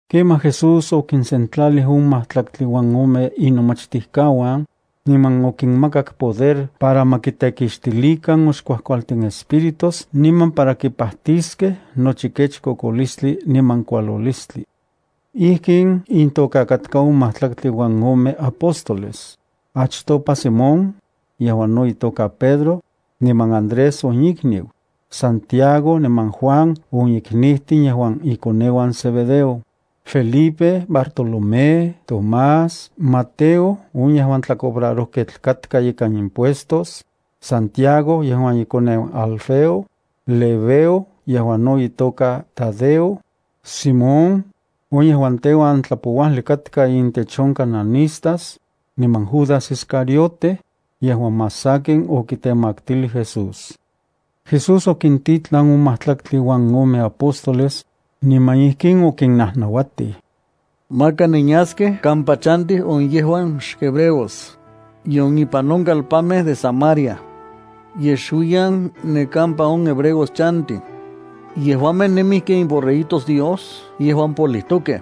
Kemaj Jesús okinsentlalij on majtlaktli uan ome inomachtijkauan, niman okinmakak poder para ma kitekixtilikan on xkuajkualtin espíritus niman para kipajtiskej nochi kech kokolistli niman kualolistli. Ijkin intoka katkaj on majtlaktli uan ome apóstoles: achtopa Simón, yejuan no itoka Pedro, niman Andrés on ikniu, Santiago niman Juan on iknijtin yejuan ikoneuan Zebedeo, Felipe, Bartolomé, Tomás, Mateo on yejuan tlacobrarojketl katka ikan impuestos, Santiago yejuan ikoneu Alfeo, Lebeo, yejuan no itoka Tadeo, Simón, on yejuan teuan tlapouajli katka intech on cananistas, niman Judas Iscariote, yejuan más sakin okitemaktilij Jesús. Jesús okintitlan on majtlaktli uan ome apóstoles, niman ijkin okinnajnauatij: —Maka nenyaskej kampa chantij on yejuan xhebreos, nion ipan on kalpanmej de Samaria. Yej xuiyan ne kampa on hebreos chantij. Yejuamej nemij ken iborreguitos Dios yejuan polijtokej.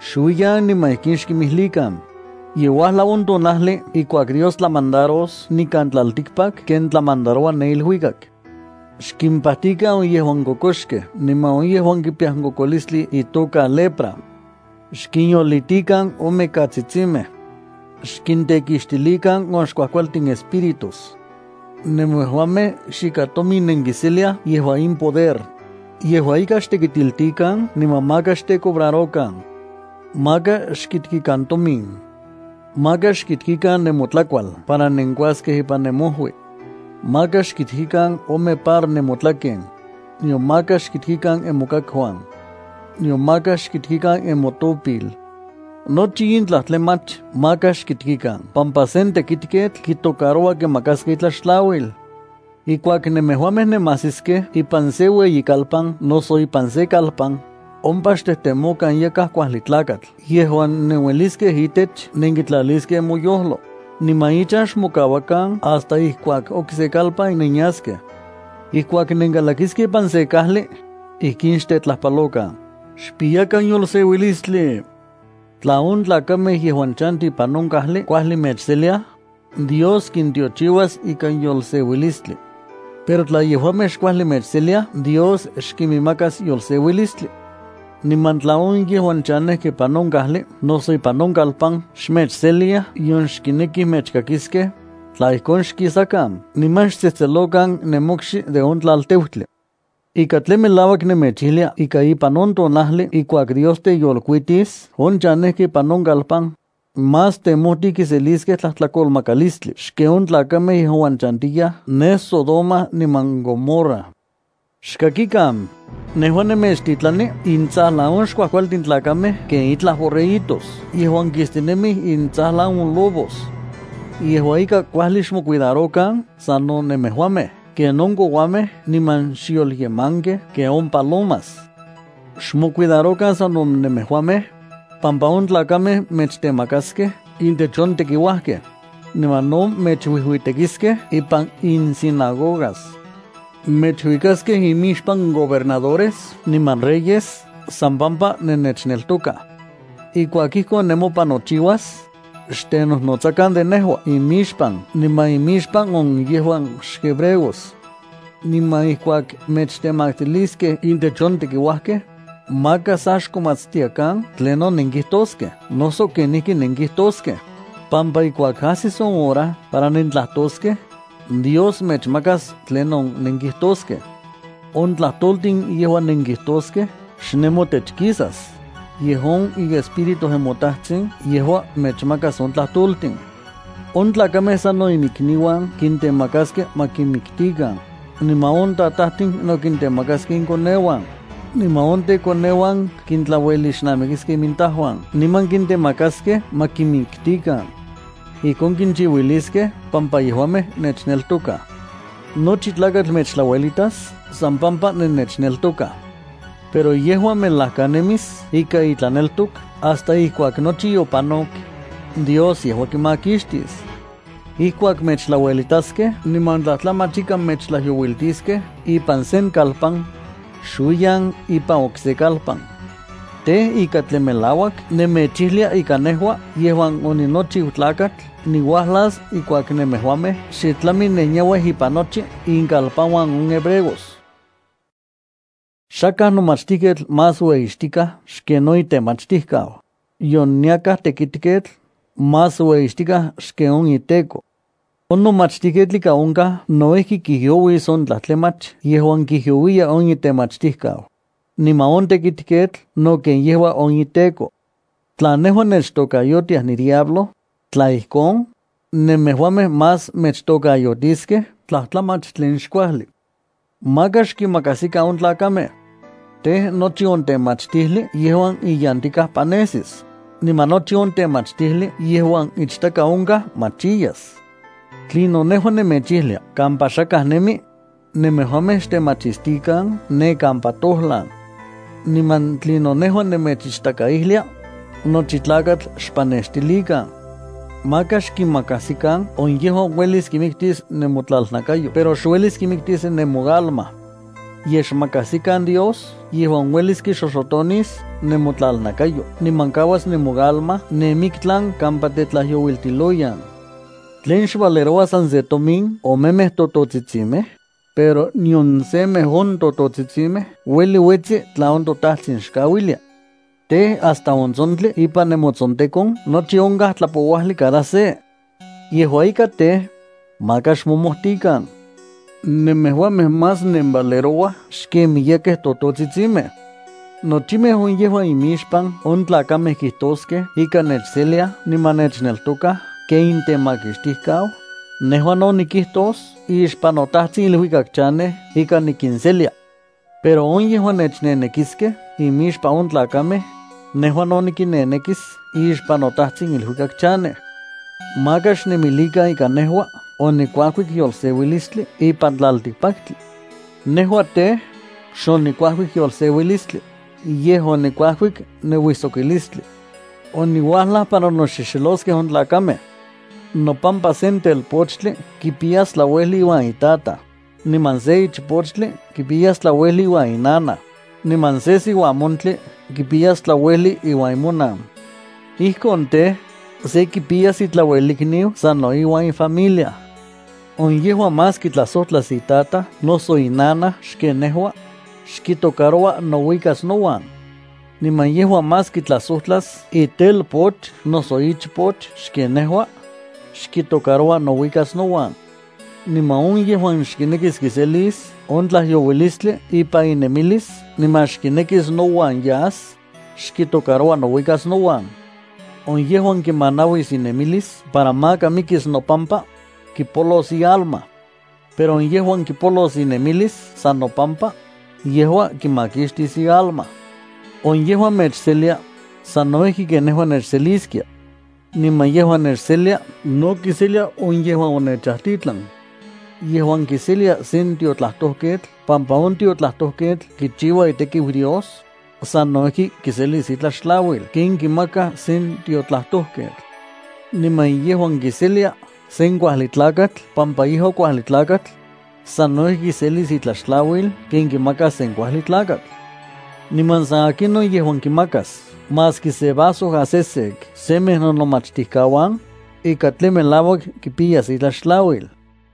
Xuiyan niman ijkin xkinmijlikan: “Ye uajlau on tonajli ijkuak Dios tlamandaros nikan tlaltikpak ken tlamandaroua ne iluikak.” Xkimpajtikan on yejuan kokoxkej niman on yejuan kipiyaj on kokolistli itoka lepra. Xkinyolitikan on mikatsitsimej. Xkintekixtilikan on xkuajkualtin espíritus. Nemejuamej xikan tomin nenkiseliaj yejua in poder, yejua ika xtekitiltikan niman maka xtecobrarokan. ’Maka xkitkikan tomin. Maka xkitkikan nemotlakual para nenkuaskej ipan nemojui. Maka xkitkikan ome par nemotlaken, nion maka xkitkikan nemokakuan. Nion maka xkitkikan nemotopil. Nochi in tlajtlamach maka xkitkikan, pampa sen tekitketl kitocaroua kimakaskej itlaxtlauil. ’Ijkuak nemejuamej nemajsiskej ipan sen ueyikalpan noso ipan sen kalpan, ompa xtejtemokan yakaj kuajli tlakatl yejuan nenueliskej itech nenkitlaliskej nemoyojlo, niman ichan xmokauakan hasta ijkuak okse kalpan nenyaskej. Ijkuak nenkalakiskej ipan sen kajli, ijkin xtetlajpalokan: “Xpiyakan yolseuilistli.” Tla on tlakamej yejuan chantij ipan on kajli kuajli mechseliaj, Dios kintiochiuas ikan yolseuilistli. Pero tla yejuamej xkuajli mechseliaj, Dios xkiminmakas yolseuilistli. Niman tla on yejuan chanejkej ipan on kajli noso ipan on kalpan xmechseliaj nion xkinekij mechkakiskej, tla ijkon xkisakan niman xtsejtselokan nemokxi de on tlalteutli. Ika tlen melauak nemechijlia ika ipan on tonajli ijkuak Dios teyolkuitis on chanejkej ipan on kalpan, más temojtij kiseliskej tlajtlakolmakalistli xken on tlakamej yejuan chantiyaj ne Sodoma niman Gomorra. ’¡Xkakikan! Nejua nemechtitlani intsajlan on xkuajkualtin tlakamej ken itlaj borreguitos yejuan kistinemij intsajlan on lobos. Yejua ika kuajli xmocuidarokan sano nemejuamej ken on kouamej niman xyolyemankej ken on palomas. Xmocuidarokan sano nemejuamej, pampa on tlakamej mechtemakaskej intech on tekiuajkej, niman no mechuijuitekiskej ipan insinagogas. Mechuikaskej imixpan gobernadores niman reyes san pampa nennechneltokaj. Ijkuak ijkon nemopan nochiuas, xtenojnotsakan de nejua imixpan niman imixpan on yejuan xhebreos. Niman ijkuak mechtemaktiliskej intech on tekiuajkej, maka sa xkomatstiakan tlinon nenkijtoskej noso kenijki nenkijtoskej, pampa ijkuak ajsis on hora para nentlajtoskej, Dios mechmakas tlinon nenkijtoskej. On tlajtoltin yejuan nenkijtoskej xnemotech kisas, yej on iEspíritu nemoTajtsin yejua mechmakas on tlajtoltin. ’On tlakamej sano iminikniuan kintemakaskej ma kinmitikan, niman on tatajtin no kintemakaskej inkoneuan, niman on tekoneuan kintlauelixnamikiskej intajuan niman kintemakaskej ma kinmiktikan. Ijkon kinchiuiliskej pampa yejuamej nechneltokaj. Nochi tlakatl mechtlauelitas san pampa nennechneltokaj. Pero yejuan melajkanemis ikan itlaneltok hasta ijkuak nochi yopanok, Dios yejua kimakixtis. Ijkuak mechtlauelitaskej niman tlajtlamach ika mechtlajyouiltiskej ipan sen kalpan, xuiyan ipan okse kalpan. Tej, ika tlen melauak nemechijlia ika nejua yejuan oninochiu Tlakatl niuajlas ijkuak nemejuamej xe tlami nenyauij ipan nochi inkalpanuan on hebreos. ’Xakaj nomachtijketl más ueyixtikaj xken on itemachtijkau, nion yakaj tekitketl más ueyixtikaj xken on iteko. On nomachtijketl ika onkaj no ijki kijyouis on tlajtlamach yejuan kijyouiya on itemachtijkau, niman on tekitketl no ken yejua on iteko. Tla nejua nechtokayotiaj nidiablo, tla ijkon, nemejuamej más mechtokayotiskej tlajtlamach tlen xkuajli. ’Maka xkinmakajsikan on tlakamej. Tej, nochi on temachtijli yejuan iyantikaj panesis, niman nochi on temachtijli yejuan ichtaka onkaj machiyas. Tlinon nejua nemechijlia kampa xakaj nemi, nemejuamej xtemachistikan ne kampa tojlan. Niman tlinon nejua nemechichtakaijlia, nochi tlakatl xpanextilikan. Maka xkinmakajsikan on yejuan uelis kimiktis nemotlalnakayo pero xuelis kimiktis nemoalma. Yej xmakajsikan Dios yejuan uelis kixoxotonis nemotlalnakayo niman kauas nemoalma ne miktlan kampa tetlajyouiltiloyan. ’¿Tlen xvalerouaj san se tomin omemej tototsitsimej? Pero nion semej on tototsitsimej ueli uetsi tla on toTajtsin xkauilia. Tej, hasta on tsontli ipan nemotsontekon nochi onkaj tlapouajli cada se. Yejua ika tej, maka xmomojtikan. Nemejuamej más nenvalerouaj xken miyekej tototsitsimej. ’Nochimej on yejuan imixpan on tlakamej kijtoskej ika nechseliaj niman nechneltokaj ken intemakixtijkau, nejua no nikijtos ixpan noTajtsin iluikak chanej ika nikinselia. Pero on yejuan nechnenekiskej imixpan on tlakamej, nejua no nikinnenekis ixpan noTajtsin iluikak chanej. ’Maka xnemilikan ika nejua onikuajkik yolseuilistli ipan tlaltikpaktli. Nejua tej, xonikuajkik yolseuilistli, yej onikuajkik nouijsokilistli. Oniuajlaj para noxexeloskej on tlakamej. Nopampa sen telpochtli kipiyas tlauejli iuan itataj, niman sen ichpochtli kipiyas tlauejli iuan inanaj, niman sen siuamontli kipiyas tlauejli iuan imonan. Ijkon tej, se kipiyas itlauelikniu sano ifamilia. ’On yejuan más kitlajsojtlas itataj noso inanaj xken nejua, xkitocaroua nouikas nouan. Niman yejuan más kitlajsojtlas itelpoch noso ichpoch xken nejua, xkitocaroua nouikas nouan. Niman on yejuan xkinekis kiselis on tlajyouilistli ipan inemilis niman xkinekis nouan yas, xkitocaroua nouikas nouan. On yejuan kimanauis inemilis para maka mikis nopampa, kipolos ialma. Pero on yejuan kipolos inemilis san nopampa, yejua kimakixtis ialma. ’On yejuan mechselia, sano ijki ken nejua nechseliskia. Niman yejuan nechselia no kiselia on yejuan onechajtitlan. Yejuan kiselia sen tiotlajtojketl pampa on tiotlajtojketl kichiua itekiu Dios, sano ijki kiselis itlaxtlauil ken kimakaj sen tiotlajtojketl. Niman yejuan kiselia sen kuajli tlakatl pampa yejua kuajli tlakatl, sano ijki kiselis itlaxtlauil ken kimakaj sen kuajli tlakatl. Niman san akinon yejuan kimakas maski se vaso asesek semej nonomachtijkauan, ika tlen melauak kipiyas itlaxtlauil.